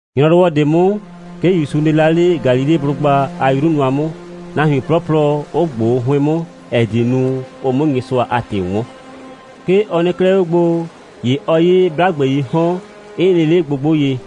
‑Nyrɔwɔ ꞊de 'mʋ, 'ke ‑Yusu nɩ la 'le Galileblʋgba a 'yru nʋa 'mʋ, nahuin 'plɔplɔ 'ʋ ꞊gboo 'hʋɩn 'mʋ, ‑ɛ die nu, ʋ 'mʋ Nyɩsʋa a ‑tɩ 'wɔn. 'Ke ɔ nɩ 'klɛɛ 'o gbo, ‑ye ɔ 'ye 'blagbeii 'hɔn, 'ɩ nɩ 'le gbogbo ye.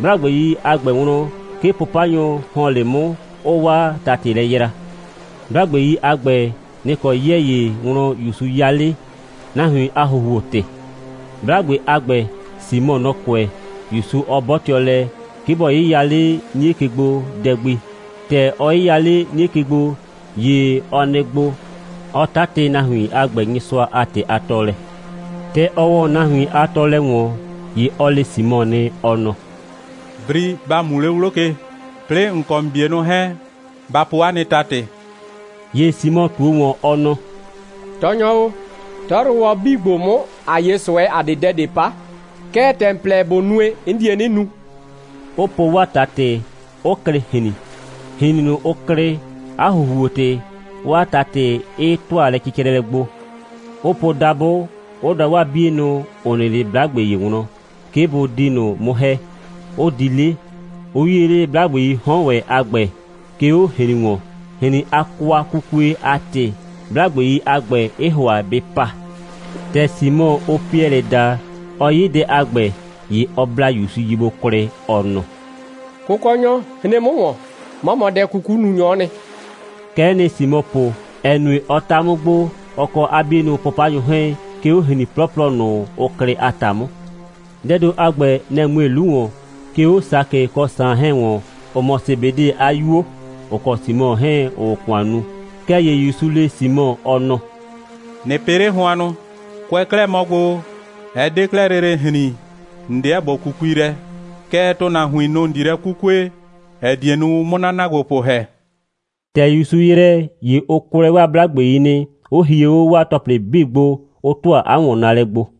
'Blagbei a ‑gbɛ wlɔn, 'ke 'pʋpanyʋ ‑hɔn 'le 'mʋ, 'ʋʋ 'waa ‑tatɩ lɛ yra. 'Blagbei ‑a gbɛ, nɩ‑ kɔ 'yɛɛ ‑ye wlɔn ‑Yusu 'ya 'le, nahuin a ‑huhuo‑tɩ. 'Blagbe a ‑gbɛ, Simɔ, nɔ‑ kʋɛ, ‑Yusu 'ɔ 'bɔtɩɔ lɛ, 'ke bɔ 'yɩya 'le 'nie ke gbo dɛ gbi. ‑Tɛ ʋ 'yɩya 'le 'nie ke gbo, ‑ye ɔ nɩ gbo, 'ɔ ‑tʋa nahuin a ‑gbɛ Nyɩsʋa a ‑tɩ a tɔɔlɛ gbo. ‑Tɛ ɔ ‑wɔ nahuin a tɔɔlɛ ‑wɔn, ‑ye ɔ le Simɔ nɩ, ɔ nɔ: «Bri, ‑ba mu 'le 'wlo ke, 'plɩɩ ‑n kɔ ‑n 'bienʋ 'hɛɛn, ba po 'a nɩ ‑tatɩ.» ‑Ye Simɔ ꞊tuo ‑wɔn, ɔ nɔ: «Tɔɔnyɔ o, 'tɔyrʋwɔ 'bii ‑gbo 'mʋ, ‑a 'ye ꞊sʋɛ, ‑a 'de dɛ ꞊de 'pa. Kɛɛ, ‑tɛ ‑n plɛ ꞊bo nue, 'n die 'nɩ nu,» 'ʋ po 'waa ‑tatɩ, 'ʋ klɩ ‑hrin. ‑Hrin ꞊nʋ, ʋ klɩ, 'a ‑huhuo‑tɩ, 'waa ‑tatɩ 'ɩ ‑tʋa lɛcɩcrɛlɛ gbo, 'ʋ po dabʋ, 'ʋ da 'waa 'bienʋ, ‑ʋ nɩ 'le 'blagbe ‑ye wlɔn, 'ke bʋ di ꞊nʋ 'mʋ ‑hɛ, 'ʋ di 'le, 'ʋ 'yie 'le 'blagbeii 'hɔn ‑wɛ a ‑gbɛ, 'ke 'o ‑hrin ‑wɔn. ‑Hrin a kwakukue a ‑tɩ, 'blagbei a ‑gbɛ, ɩɩ ‑hʋa bɩ pa. ‑Tɛ Simɔ, ʋʋ Piɛlɩ daa, ɔ 'ye dɛ a ‑gbɛ, ‑ye ɔ bla ‑Yusu ye gbo kwlɩ, ɔ nɔ: «Kʋkɔnyɔ, hren 'mʋ ‑wɔn, 'mɔ mɔ dɛ'kukununyɔ'ɔ nɩ!» Kɛ'ɛ nɩ Simɔ po, ‑ɛ nue, ɔ 'ta 'mʋ gbo, ɔ kɔ 'a 'bienʋ 'pʋpanyʋ 'hɛɛn, 'ke 'o ‑hrin 'plɔplɔ ꞊nʋ, ʋ klɩ a ‑ta 'mʋ. Dɛɛ ‑do a ‑gbɛ, nɛ‑ mue 'lu ‑wɔn, 'ke 'o Sakɩ kɔ Saan 'hɛɛn ‑wɔn, ‑ʋ mɔ Sebede a 'yuo, ‑ʋ kɔ Simɔ 'hɛɛn, ‑ʋʋ ‑kʋan nu. Kɛɛ ‑ye ‑Yusu le Simɔ, ɔ nɔ: «꞊Nɩ pɩ 'le hʋannʋ. Kʋɛ kɛ 'klɛɛ mɔ gbo, ɛ 'de 'klɛɛ lele ‑hrin, ‑n 'deɛ ‑bo 'kukui lɛ, kɛɛ, ‑tʋnahuin, nʋ‑ ‑n di lɛ 'kukue, ‑ɛ die nu, ʋ 'mʋ 'na ‑naagbopʋ ‑hɛ.» ‑Tɛ ‑Yusu ‑yrɛ, ‑ye ʋ kwlɛɛ 'waa 'blagbei nɩ, 'ʋ hie 'o 'waa ‑tɔplɩ 'bii gbo, 'ʋ ‑tʋa 'a ‑wɔnnaalɛ gbo.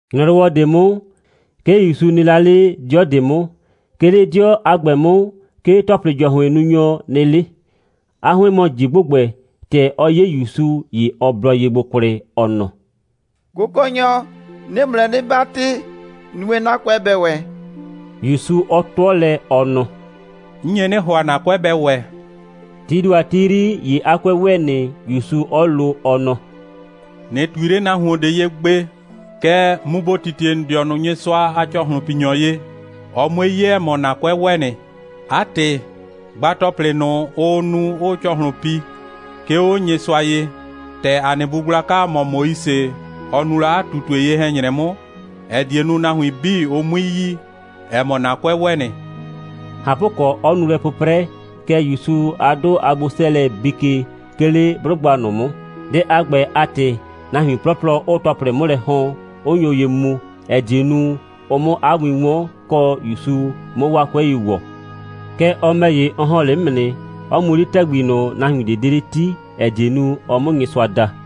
‑Nyrɔwɔ ꞊de 'mʋ, 'ke ‑Yusu nɩ la 'le 'dɩɔ ꞊de 'mʋ. 'Ke 'le 'dɩɔ a ‑gbɛ 'mʋ, 'ke ‑tɔplɩ‑jɔhʋɩnnunyɔ nɩ 'le. 'A 'hʋɩn mɔ ꞊ji ‑gbʋgbɛ. ‑Tɛ ɔ 'ye ‑Yusu, ‑ye ɔ blɔ ye gbo kwlɩ, ɔ nɔ: «Kʋkɔnyɔ, 'nɩɩ ‑mʋ lɛ 'nɩ 'batɩ, nue, 'na 'kʋɛ bɛ ‑wɛ!» ‑Yusu 'ɔ 'tʋɔ lɛ, ɔ nɔ: «'N nye 'nɩ ‑hʋa, ‑na 'kʋɛ bɛ ‑wɛ.» Tii ‑do a ti 'yri, ‑ye 'a 'kʋɛ ‑wɛ nɩ, ‑Yusu 'ɔ lo, ɔ nɔ: «꞊Nɩ ꞊tui 'le nahuon ꞊de ye gbe! Kɛɛ, mu ‑bo titie ‑n dɩɔnʋ Nyɩsʋa a ‑cɔhlʋnpinyɔ ye, ɔ 'mue 'ye, ‑ɛ mɔ, ‑na 'kʋɛ ‑wɛ nɩ. 'A ‑tɩ, gba ‑tɔplɩ ꞊nʋ, ʋʋ nu, 'ʋʋ ‑cɔhlʋn pi, 'ke 'o Nyɩsʋa ye, ‑tɛ ‑a nɩ bu gblaka, ‑ɔ mɔ Moise, ɔ nu la 'a ꞊tutue ye‑hɛ‑nyrɛ 'mʋ, ‑ɛ die nu, nahuin 'bii, ʋ 'mui yi, ‑ɛ mɔ, ‑na 'kʋɛ ‑wɛ nɩ!» ꞊Hapʋkɔ, 'ɔ nu lɛ 'pʋprɛ, kɛɛ, ‑Yusu a 'dʋ a gbo'sɛɛlɛ bii ke, 'ke 'le 'blʋgba ꞊nʋ 'mʋ. Dɛ a ‑gbɛ a ‑tɩ, nahuin 'plɔplɔ 'ʋʋ ‑tɔplɩ 'mʋ lɛ ‑hɔn, 'ʋ nyo ye mu, ‑ɛ die nu, ʋ 'mʋ 'a win 'wɔn, kɔ, ‑Yusu 'mʋ 'waa 'kʋɛi ‑wɔ. Kɛɛ, ɔ ‑mɛ ‑ye, ɔ ‑hɔn 'le 'mʋ nɩ, 'ɔ mu 'le ‑tɛgbi ꞊nʋ, nahuin ꞊de 'de 'le 'ti, ‑ɛ die nu, ɔ 'mʋ Nyɩsʋa da.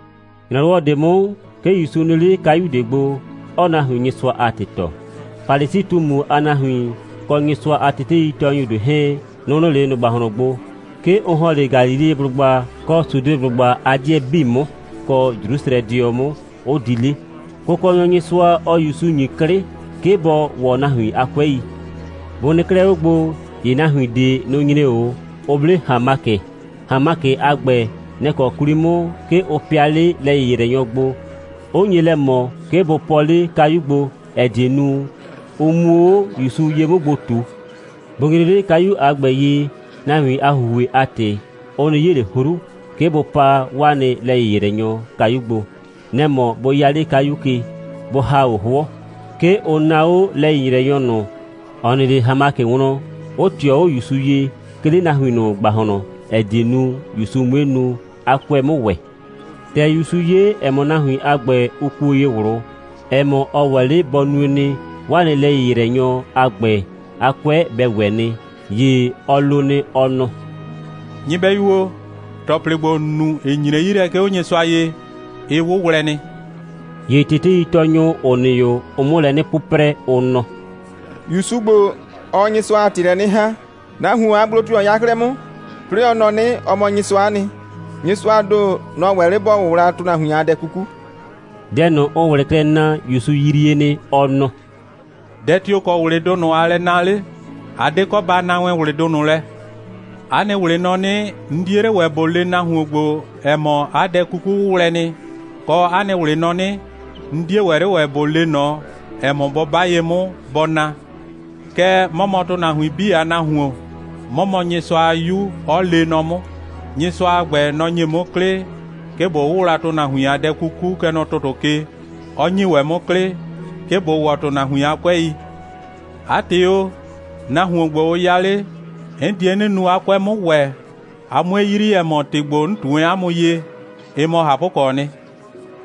‑Nyrɔwɔ ꞊de 'mʋ, 'ke ‑Yusu nɩ la 'le kayu ꞊de gbo, 'ɔɔ nahuin Nyɩsʋa a ‑tɩ tɔɔ. Falisi꞊tumu a nahuin, kɔ Nyɩsʋa a teteitɔɔnyʋ ꞊de 'hɛɛn, nʋ‑ nɩ 'le ꞊nʋ ‑gbahlɔn gbo. 'Ke ʋ ‑hɔn 'le Galileblʋgba kɔ Sudeblʋgba a 'dɩɛ 'bii 'mʋ, kɔ Jrusrɛdɩɔ 'mʋ, 'ʋ di 'le. Kʋkɔnyɔ Nyɩsʋa, ɔɔ ‑Yusu ‑nyi 'klɩ, 'ke bɔ ‑wɔ nahuin a 'kʋɛi. Bʋ nɩ 'klɛɛ 'o gbo, ‑ye nahuin ꞊de, nʋ‑ nyre 'o, 'ʋ 'ble ‑hanmakɩ. ‑Hanmakɩ a ‑gbɛ, nɛ‑ kɔ 'kwli 'mʋ, 'ke ʋ pɩa 'le lɛ‑yɩyrɛnyɔ gbo, 'ʋ nye lɛ ꞊mɔ, 'ke bʋ pɔɔ 'le kayu gbo, ‑ɛ die nu, ʋ 'muo 'o ‑Yusu ye 'mʋ gbo ꞊tu. Bʋ nyre 'le kayu a ‑gbɛ ye, nahuin a ‑huhue a ‑tɩ, ʋ 'nɩ 'ye ꞊le 'hru, 'ke bʋ paa 'waa nɩ lɛ‑yɩyrɛnyɔ kayu gbo. Nɛ‑ mɔ bʋ 'ya 'le kayu ke, bʋ ‑ha 'o 'hʋɔ. 'Ke ʋ naa 'o lɛ‑yɩyrɛnyɔ ꞊nʋ, ‑ɔ nɩ 'le ‑hanmakɩ wlɔn, 'ʋ ꞊tɩɔ 'o ‑Yusu ye, 'ke 'le nahuin ꞊nʋ ‑gbahlɔn, ‑ɛ die nu, ‑Yusu 'mue nu, 'a 'kʋɛ 'mʋ ‑wɛ. ‑Tɛ ‑Yusu 'ye, ‑ɛ mɔ, nahuin a ‑gbɛ, ʋ kuo ye ꞊wlʋ, ‑ɛ mɔ, ɔ ‑wɛ 'le bɔ nue nɩ, 'waa nɩ lɛ‑yɩyrɛnyɔ a ‑gbɛ, 'a 'kʋɛ bɛ ‑wɛ nɩ, ‑ye ɔ lo nɩ, ɔ nɔ: «Nyɩbɛyu o, ‑tɔplɩ ‑gbo, ‑n nu, ‑ɩ nyre 'yi lɛ, 'ke 'o Nyɩsʋa ye, ɩ 'wʋwlɛ nɩ.» ‑Ye teteitɔɔnyʋ, ‑ʋ nɩ 'o, ʋʋ 'mʋ lɛ 'nɩ 'pʋprɛ, ʋ nɔ: «‑Yusu ‑gbo, ɔɔ Nyɩsʋa a ‑tɩ lɛ 'nɩ ‑haa. Nahuon a gblo tio‑ ɔ 'ya 'klɛɛ 'mʋ? 'Plɩɩ ɔ nɔ 'nɩ, ɔ mɔ Nyɩsʋa'a nɩ. Nyɩsʋaa ‑do, nɔ‑ ‑wɛ 'le ‑bɔ 'wʋwla ‑tʋnahuin a dɛ 'kuku.» Dɛ ꞊nʋ, ʋʋ ꞊wlɩ klɛ naa, ‑Yusu yrie nɩ. Ɔ nɔ: «Dɛ tio‑ kɔ ꞊wlɩdʋ ꞊nʋ aa lɛ naa 'le? A 'de kɔ ba naa wɛn ꞊wlɩdʋ ꞊nʋ lɛ. 'A nɩ ꞊wlɩ nɔ 'nɩ, 'n 'die 'le ‑wɛ ꞊bo le nahuon ‑gbo, ‑ɛ mɔ, 'a dɛ 'kuku 'wʋwlɛ nɩ, kɔ, 'a nɩ ꞊wlɩ nɔ 'nɩ, 'n 'die ‑wɛ 'le ‑wɛ ꞊bo le ꞊nɔ, ‑ɛ mɔ, bɔ 'ba ye 'mʋ, bɔ na. Kɛɛ, 'mɔ mɔ ‑tʋnahuin 'bii a Nahuon, 'mɔ mɔ Nyɩsʋa a 'Yu, 'ɔ lee nɔ 'mʋ. Nyɩsʋa a ‑gbɛ, nɔ‑ ‑nye 'mʋ 'klɩ, 'ke ꞊bo 'wʋwla ‑tʋnahuin a dɛ 'kuku, kɛ nɔ ‑tʋtʋ ke, 'ɔ ‑nye ‑wɛ 'mʋ 'klɩ, 'ke ꞊bo ‑wɔ ‑tʋnahuin a 'kʋɛi. 'A ‑tɩ o, nahuon ‑gbo, ʋ ya 'le, 'n die 'nɩ nu, 'a 'kʋɛ 'mʋ ‑wɛ, a 'mue yrii, ‑ɛ mɔ, ‑tɩ ‑gbo, 'n ꞊tu wɛn 'a mʋ ye, ɩ mɔ ꞊hapʋkɔɔ nɩ.»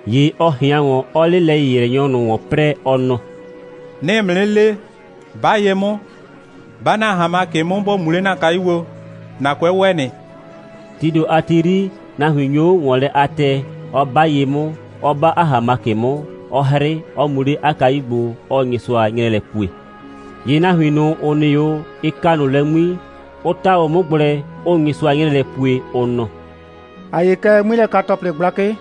‑Ye ɔ ꞊hɩan ‑wɔn, 'ɔɔ 'le lɛ‑yɩyrɛnyɔ ꞊nʋ ‑wɔn 'prɛɛ, ɔ nɔ: «'Nɩɩ ‑mʋ 'nɩ le, 'ba ye 'mʋ, 'ba ‑na ‑hanmakɩ 'mʋ, ‑bo mu 'le ‑na kayu gbo, ‑na 'kʋɛ ‑wɛ nɩ.» Tii ‑do a ti 'yri, nahuin nyo 'o ‑wɔn lɛ a tɛɛ, 'ɔ 'ba ye 'mʋ, 'ɔ 'ba 'a ‑hanmakɩ 'mʋ, 'ɔ 'hrɩ, 'ɔ mu 'le 'a kayu gbo, 'ɔɔ Nyɩsʋa 'nyrɛɛ lɛ pue. ‑Ye nahuin ꞊nʋ, ‑ʋ nɩ 'o, ɩ ka ꞊nʋ lɛ 'ŋmi, 'ʋ 'ta 'o 'mʋ gblɛ, 'ʋʋ Nyɩsʋa 'nyrɛɛ lɛ pue, ʋ nɔ: «‑A 'ye kɛ 'ŋmilɛka‑tɔplɩ gblakɩ.»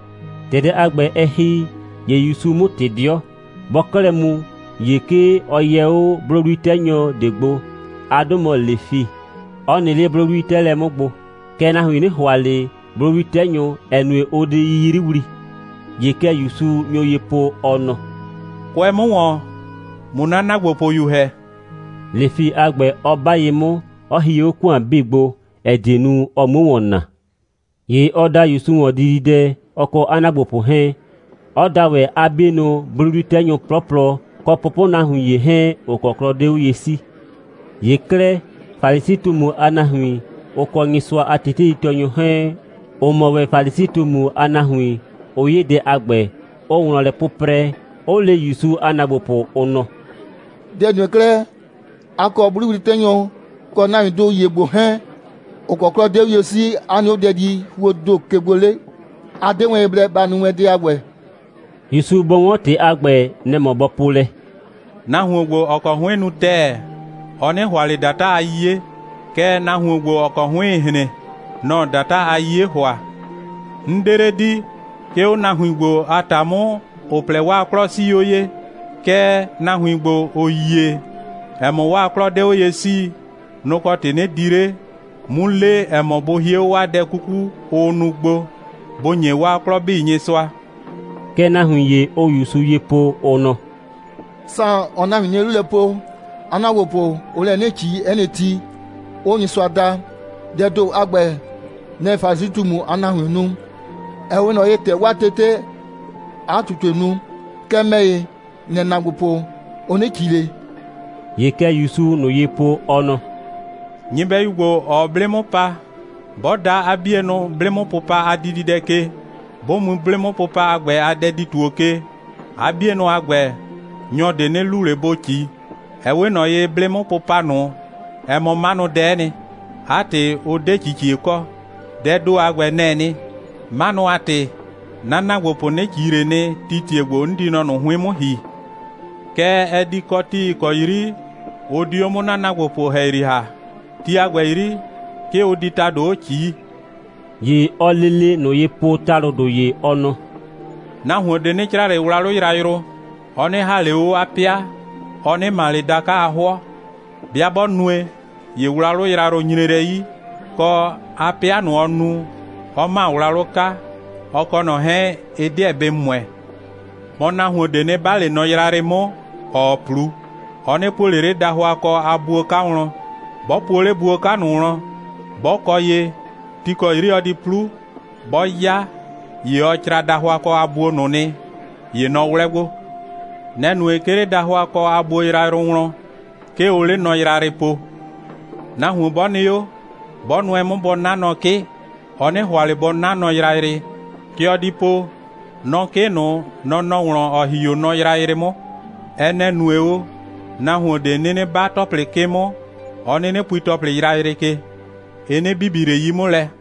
‑Tɛ dɛ a ‑gbɛ, ɛ ‑hi, ‑ye ‑Yusuu 'mʋ ꞊tɩ 'dɩɔ. Bɔɔ 'klɛɛ mu, ‑ye 'ke ɔ yɛ 'o 'blʋwli'tɛnyɔ ꞊de gbo. 'A 'dʋ mɔ Lefi, 'ɔ nɩ 'le 'blʋwli'tɛɛlɛ 'mʋ gbo. (Kɛɛ, nahuin 'nɩ ‑hʋa ꞊le 'blʋwli'tɛnyʋ, ‑ɛ nue, ʋʋ di 'yiyriwli.) ‑Ye kɛ ‑Yusu nyo ye po, ɔ nɔ: «Kʋɛ 'mʋ ‑wɔn, ꞊mʋ 'na ‑naagbopʋyu ‑hɛ!» Lefi a ‑gbɛ 'ɔ 'ba ye 'mʋ, 'ɔ hie 'o ‑kʋan 'bii gbo, ‑ɛ die nu, ɔ 'muo ‑wɔn naa. ‑Ye ɔ da ‑Yusu ‑wɔn dididɛ, ɔ kɔ 'a ‑naagbopʋ 'hɛɛn, 'ɔ da ‑wɛ 'a 'bienʋ 'blʋwli'tɛnyʋ 'plɔplɔ, kɔ pʋpʋnahuin ‑ye 'hɛɛn, ‑ʋ kɔ 'klɔ 'de 'o ye 'sii. ‑Ye 'klɛɛ, Falisi꞊tumu a nahuin, ʋ kɔ Nyɩsʋa a teteitɔɔnyʋ 'hɛɛn, ‑ʋ mɔ ‑wɛ Falisi꞊tumu a nahuin, ʋ 'ye dɛ a ‑gbɛ, 'ʋʋ wlɔn lɛ 'pʋprɛ, 'ʋ le ‑Yusu a ‑naagbopʋ, ʋ nɔ: «Dɛ‑ nue 'klɛɛ, a kɔ 'blʋwli'tɛnyʋ kɔ nahuindʋ ‑ye ‑gbo 'hɛɛn, ‑ʋ kɔ 'klɔ 'de 'o ye 'sii, 'a nɩ 'o dɛdihuoo ‑do ke gbo 'le? A 'de wɛn ye blɛ ba nu wɛn dɛ a ‑gbɛ.» ‑Yusu bɔ 'wɔn ‑tɩ a ‑gbɛ, nɛ‑ mɔ bɔ po lɛ: «Nahuon ‑gbo, ‑ɔ kɔ 'hʋɩn nu ‑tɛɛ, ɔ 'nɩ ‑hʋa ꞊le ‑data a 'yiye, kɛɛ, nahuon ‑gbo, ‑ɔ kɔ 'hʋɩɩn‑ hren, nɔ‑ɔ ‑data a 'yiye ‑hʋa. 'N 'de 'le di, 'ke 'o nahuin ‑gbo a ‑ta 'mʋ, ‑ʋ plɛ, 'waa 'klɔ 'sii 'o ye, kɛɛ, nahuin ‑gbo, ‑ʋ yie, ‑ɛ mɔ, 'waa 'klɔ 'de 'o ye 'sii, nʋ‑ kɔ ‑tɩ, 'nɩ di 'le, 'mu le, ‑ɛ mɔ, bʋ hie 'o 'waa dɛ 'kuku, ʋʋ nu gbo, bʋ ‑nye 'waa 'klɔ 'bii Nyɩsʋa.» Kɛ nahuin ‑ye, ʋʋ ‑Yusu ye po, ʋ nɔ: «Saan, ‑ɔɔ nahuin 'nie 'lu lɛ po, 'a ‑naagbopʋ, ʋʋ lɛ 'nɩ ꞊ci 'ɛ nɩ ti, 'ʋʋ Nyɩsʋa da. Dɛɛ ‑do a ‑gbɛ, nɛ‑ Falisi꞊tumu a nahuiin nu, ‑ɛ 'we ꞊nɔ ye, ‑tɛ 'waa tetee 'a ꞊tutue nu. Kɛɛ, ‑mɛ ‑ye, ‑n nɛ ‑naagbopʋ, ʋ 'nɩ ꞊ci ꞊le.» ‑Ye kɛ ‑Yusuu ꞊nʋ ye po, ɔ nɔ: «Nyɩbɛyu ‑gbo, ‑ɔɔ 'blɩ 'mʋ pa, 'bɔ da 'a 'bienʋ 'blɩ'mʋpʋpa a dididɛ ke, 'bʋ mu 'blɩ'mʋpʋpa a ‑gbɛ a dɛdi‑tuo ke, 'a 'bienʋ a ‑gbɛ, nyɔ ꞊de 'nɩ lu ꞊le bʋ ꞊ci. Ɛ 'we ꞊nɔ ye, 'blɩ'mʋpʋpa ꞊nʋ, ɛ mɔ 'manʋdɛ'ɛ nɩ. 'A ‑tɩ, ʋ 'de ꞊cicie kɔ. Dɛɛ ‑do a ‑gbɛ, nɛ‑ɛ nɩ. 'Manʋ a ‑tɩ 'na ‑naagbopʋ 'nɩ ꞊ci ꞊le nɩ, tii ‑tie ‑gbo 'n di mɔ ꞊nʋ 'hʋɩn 'mʋ ‑hi. Kɛɛ, ɛ di kɔ ti, ‑ɩ kɔ 'yri ʋ di 'o 'mʋ 'na ‑naagbopʋ ‑hɛyri ‑ha. Ti a ‑gbɛ 'yri, 'ke ʋ di ‑tado 'o ꞊cii.» ‑Ye ɔɔ lele ꞊nʋ ye po ‑talʋdʋ ‑ye, ɔ nɔ: «Nahuon ꞊de 'nɩ cra ꞊le wlawlʋ yrayrʋ, ɔ 'nɩ ‑ha ꞊le 'o 'a 'pɩa, ɔ 'nɩ ‑ma ꞊le da'ka a 'hʋɔ. 'Bɩa 'bɔ nue, ‑ye wlawlʋ yrayrʋ nyre lɛ 'yi, kɔ, 'a 'pɩa ꞊nʋ, ɔ nu, 'ɔ ‑ma wlawlʋ 'ka, ɔ kɔ ꞊nɔ 'hɛɛn, ɩ 'deɛ bɩ ‑mʋɛ. Mɔ, nahuon ꞊de 'nɩ 'ba ꞊le nɔ yrayrɩ 'mʋ, ‑ɔɔ 'plu, ɔ 'nɩ puo ꞊le 'le dahʋakɔ a buo 'ka wlɔn. 'Bɔ puo 'le buo 'ka ꞊nʋ wlɔn, 'bɔ kɔ ye, ti ‑kɔ ti 'yri ɔ di 'plu, 'bɔɔ 'ya, ‑ye ɔ cra dahʋakɔ a buo ꞊nʋ nɩ, ‑ye nɔ 'wlɛ gbo. Nɛ‑ nue, 'ke 'le dahʋakɔ a buo yrayrʋ wlɔn, 'ke ʋʋ 'le nɔ yrayrɩ po. Nahuon 'bɔ nɩ 'o, 'bɔ nʋɛ 'mʋ bɔ 'na nɔ 'kɩ, ɔ 'nɩ ‑hʋa ꞊le bɔ 'na nɔ yrayrɩ. Kɛ ɔ di po: Nɔ 'kɩ ꞊nʋ, nɔ‑ nɔ wlɔn, ‑ɔ ‑hi 'o nɔ yrayrɩ 'mʋ. (Ɛ nɛ‑ nue o, nahuon ꞊de 'nɩnɩ 'ba ‑tɔplɩ 'kɩ 'mʋ, 'ɔ 'nɩnɩ pui ‑tɔplɩ yrayrɩ ke. Ɩ 'nɩ bibi ꞊le 'yi 'mʋ lɛ.)»